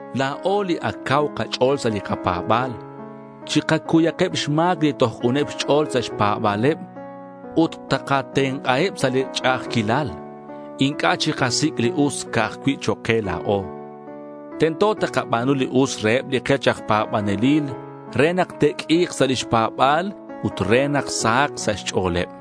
La̱o, li ac cau kach'o̱l sa' li kapa̱ba̱l, chikacuyeb xma̱c li toj k'uneb xch'o̱l sa' xpa̱ba̱leb ut takatenk'aheb sa' li ch'a'ajquilal. Inc'a' chikasic' li us ca'aj cui' chok' ke la̱o. Tento takaba̱nu li us reheb li kech aj pa̱banelil re nak te'q'ui̱k sa' lix pa̱ba̱l ut re nak sahak sa' xch'o̱leb.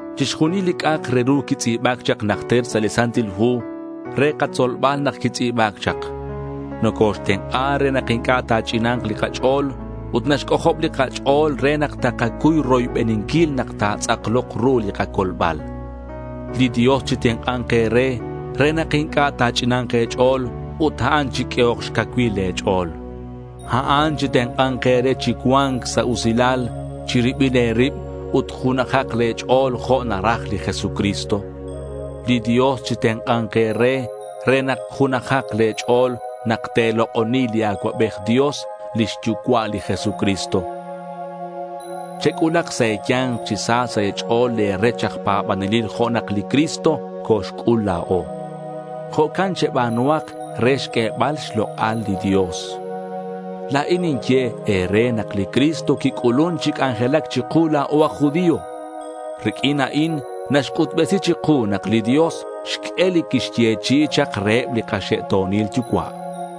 Chixjunil li c'a'ak re ru quitz'i̱ba̱c chak najter sa' li Santil Hu, re katzolbal nak quitz'i̱ba̱c chak. Nocoxtenk'a re nak inc'a' ta̱ch'ina̱nk li kach'o̱l ut naxc'ojob li kach'o̱l re nak takacuy roybeninquil nak ta̱tz'aklok ru li kacolbal. Li Dios chitenk'a̱nk e̱re re nak inc'a' ta̱ch'ina̱nk e̱ch'o̱l ut a'an chiq'uehok xcacuil le̱ ch'o̱l. A'an chitenk'a̱nk e̱re chi cua̱nc sa' usilal chi ribil e̱rib ut junajak le̱ ch'o̱l jo' naraj li Jesucristo. Li Dios chitenk'a̱nk e̱re re nak junajak le̱ ch'o̱l nak te̱lok'oni li Acuabej Dios, lix Yucua' li Jesucristo. Chec'ulak sa' e̱ya̱nk chi sa sa' e̱ch'o̱l le̱ rech aj pa̱banelil jo' nak li Cristo coxc'ul la̱o. Jo'can cheba̱nuhak re xq'uebal xlok'al li Dios. La̱in ninye e̱re nak li Cristo quic'ulun chi c'anjelac chiku la̱o aj judío. Riq'uin a'in naxc'utbesi chiku nak li Dios xq'ue li quixyechi'i chak reheb li kaxe'to̱nil yucua'.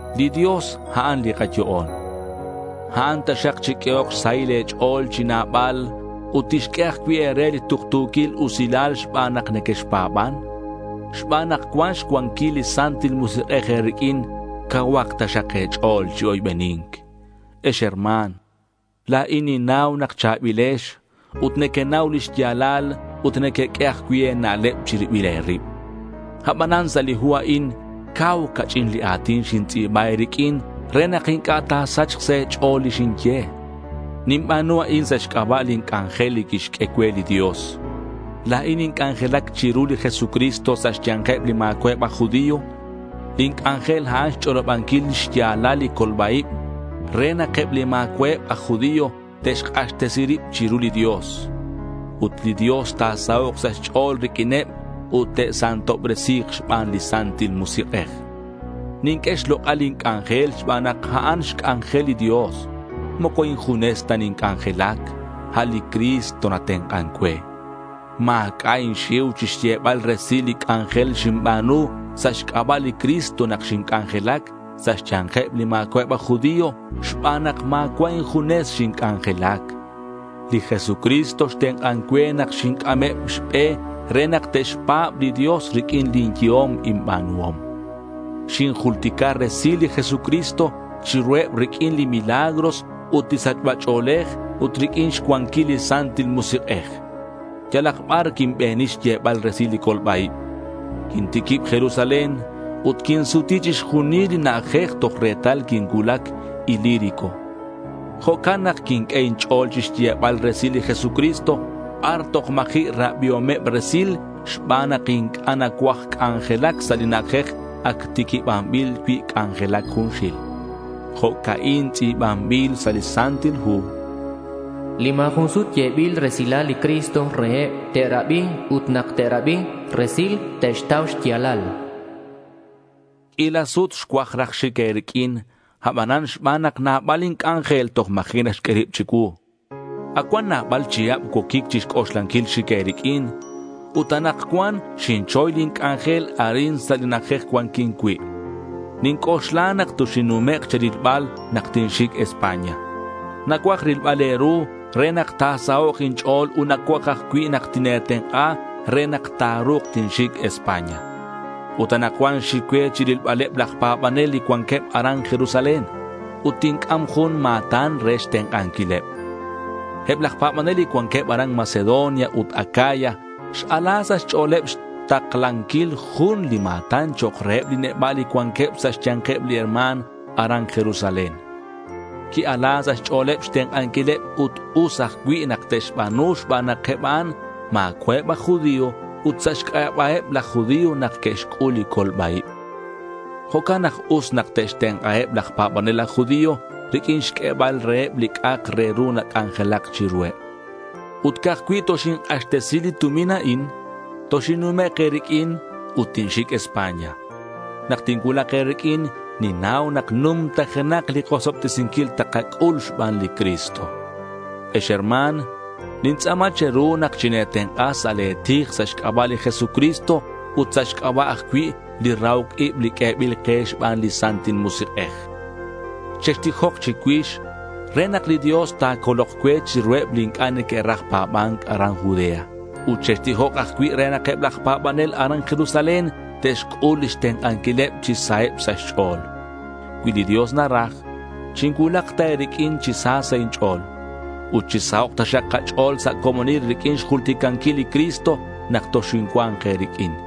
Li Dios a'an li kayo'on. A'an taxak chiq'uehok xsahil e̱ch'o̱l chi nabal ut tixq'ue ajcui' e̱re li tuktu̱quil usilal xban nak nequexpa̱ban. Xban nak cuan xcuanquil li Santil Musik'ej e̱riq'uin, cauhak taxak e̱ch'o̱l chi oybeni̱nc. Ex herma̱n, la̱in ninnau nak cha̱bilex ut nequenau li xya̱lal ut nequeq'ue ajcui' e̱na'leb chi ribil e̱rib. Abanan sa' li hu a'in cau ca'ch'in li a̱tin xintz'i̱ba e̱riq'uin re nak inc'a' ta̱sachk sa' e̱ch'o̱l li xinye. Ninba̱nu a'in sa' xc'aba' lin c'anjel li quixq'ue cue li Dios. La̱in ninc'anjelac chiru li Jesucristo sa' xya̱nkeb li ma̱cua'eb aj judío. Lin c'anjel a'an xch'olobanquil xya̱lal li colba-ib re nak eb li ma̱cua'eb aj judío te'xk'axtesi rib chiru li Dios. Ut li Dios ta̱sahok' sa' xch'o̱l riq'uineb, ut te'santobresi̱k xban li Santil Musik'ej. Ninq'ue xlok'al lin c'anjel xban nak a'an xc'anjel li Dios. Moco injunes ta ninc'anjelac. A' li Cristo natenk'an cue. Ma̱c'a' inxiu chixyebal resil li c'anjel xinba̱nu sa' xc'aba' li Cristo nak xinc'anjelac sa' xya̱nkeb li ma̱cua'eb aj judío xban nak ma̱cua' injunes xinc'anjelac. Li Jesucristo xtenk'an cue nak xinc'ameb xbe re nak te'xpa̱b li Dios riq'uin lin yehom inba̱nuhom. Xinjultica resil li Jesucristo chiruheb riq'uin li milagros ut li sachba ch'o̱lej ut riq'uin xcuanquil li Santil Musik'ej. Yalak bar quinbeni xyebal resil li colba-ib. Quintiquib Jerusalén, ut quinsuti chixjunileb li na'ajej toj retal quincuulac Ilírico. Jo'can nak quinq'ue inch'o̱l chixyebal resil li Jesucristo bar toj ma̱ji' rabiomeb resil xban nak inc'a' nacuaj c'anjelac sa' li na'ajej ac tiquibanbil cui' c'anjelac junxil. Jo'ca'in tz'i̱banbil sa' li Santil Hu: Li ma̱ jun sut yebil resilal li Cristo reheb, te'rabi. Ut nak te'rabi resil, te'xtau xya̱lal. Q'uila sut xcuaj raj xic e̱riq'uin abanan xban nak nabal inc'anjel toj ma̱ji' naxq'ue rib chicuu. Ac cuan nabal chihab cuoquic chixc'oxlanquil xic e̱riq'uin. Ut anakcuan xinchoy lin c'anjel arin sa' li na'ajej cuanquin cui'. Ninc'oxla nak toxinnumek' che̱rilbal nak tinxic España. Nacuaj rilbal e̱ru re nak ta̱sahok' inch'o̱l ut nacuaj ajcui' nak tine̱tenk'a re nak ta̱ru̱k tinxic España. Ut anakcuan xic cue chi rilbaleb laj pa̱banel li cuanqueb aran Jerusalén. Ut tinc'am jun ma̱tan re xtenk'anquileb. Eb laj pa̱banel li cuanqueb aran Macedonia ut Acaya x-ala sa' xch'o̱leb xtaklanquil jun li ma̱tan chok' reheb li neba' li cuanqueb sa' xya̱nkeb li herma̱n aran Jerusalén. Qui-ala sa' xch'o̱leb xtenk'anquileb ut us ajcui' nak te'xba̱nu xban nak eb a'an ma̱cua'eb aj judío ut sa' xc'aba'eb laj judío nak que'xc'ul li colba-ib. Jo'can nak us nak te'xtenk'aheb laj pa̱banel aj judío riq'uin xq'uebal reheb li c'a'ak re ru nac'anjelac chiruheb. Ut ca'aj cui' toxink'axtesi li tumin a'in, toxinnumek' e̱riq'uin ut tinxic España. Nak tincuulak e̱riq'uin, ninnau nak numtajenak li kosobtesinquil takac'ul xban li Cristo. Ex herma̱n, nintz'a̱ma che̱ru nak tine̱tenk'a sa' le̱ tij sa' xc'aba' li Jesucristo ut sa' xc'aba' ajcui' li rahoc ib li q'uebil ke xban li Santil Musik'ej. Chextijok chicuix re nak li Dios ta̱colok cue chiruheb li inc'a' neque'raj pa̱ba̱nc aran Judea. Ut chextijok ajcui' re nak eb laj pa̱banel aran Jerusalén te'xc'ul lix tenk'anquileb chi saheb sa' xch'o̱l. Cui li Dios naraj, chincuulak ta e̱riq'uin chi sa sa' inch'o̱l. Ut chisahok' taxak kach'o̱l sa' comonil riq'uin xjulticanquil li Cristo nak toxincua̱nk e̱riq'uin.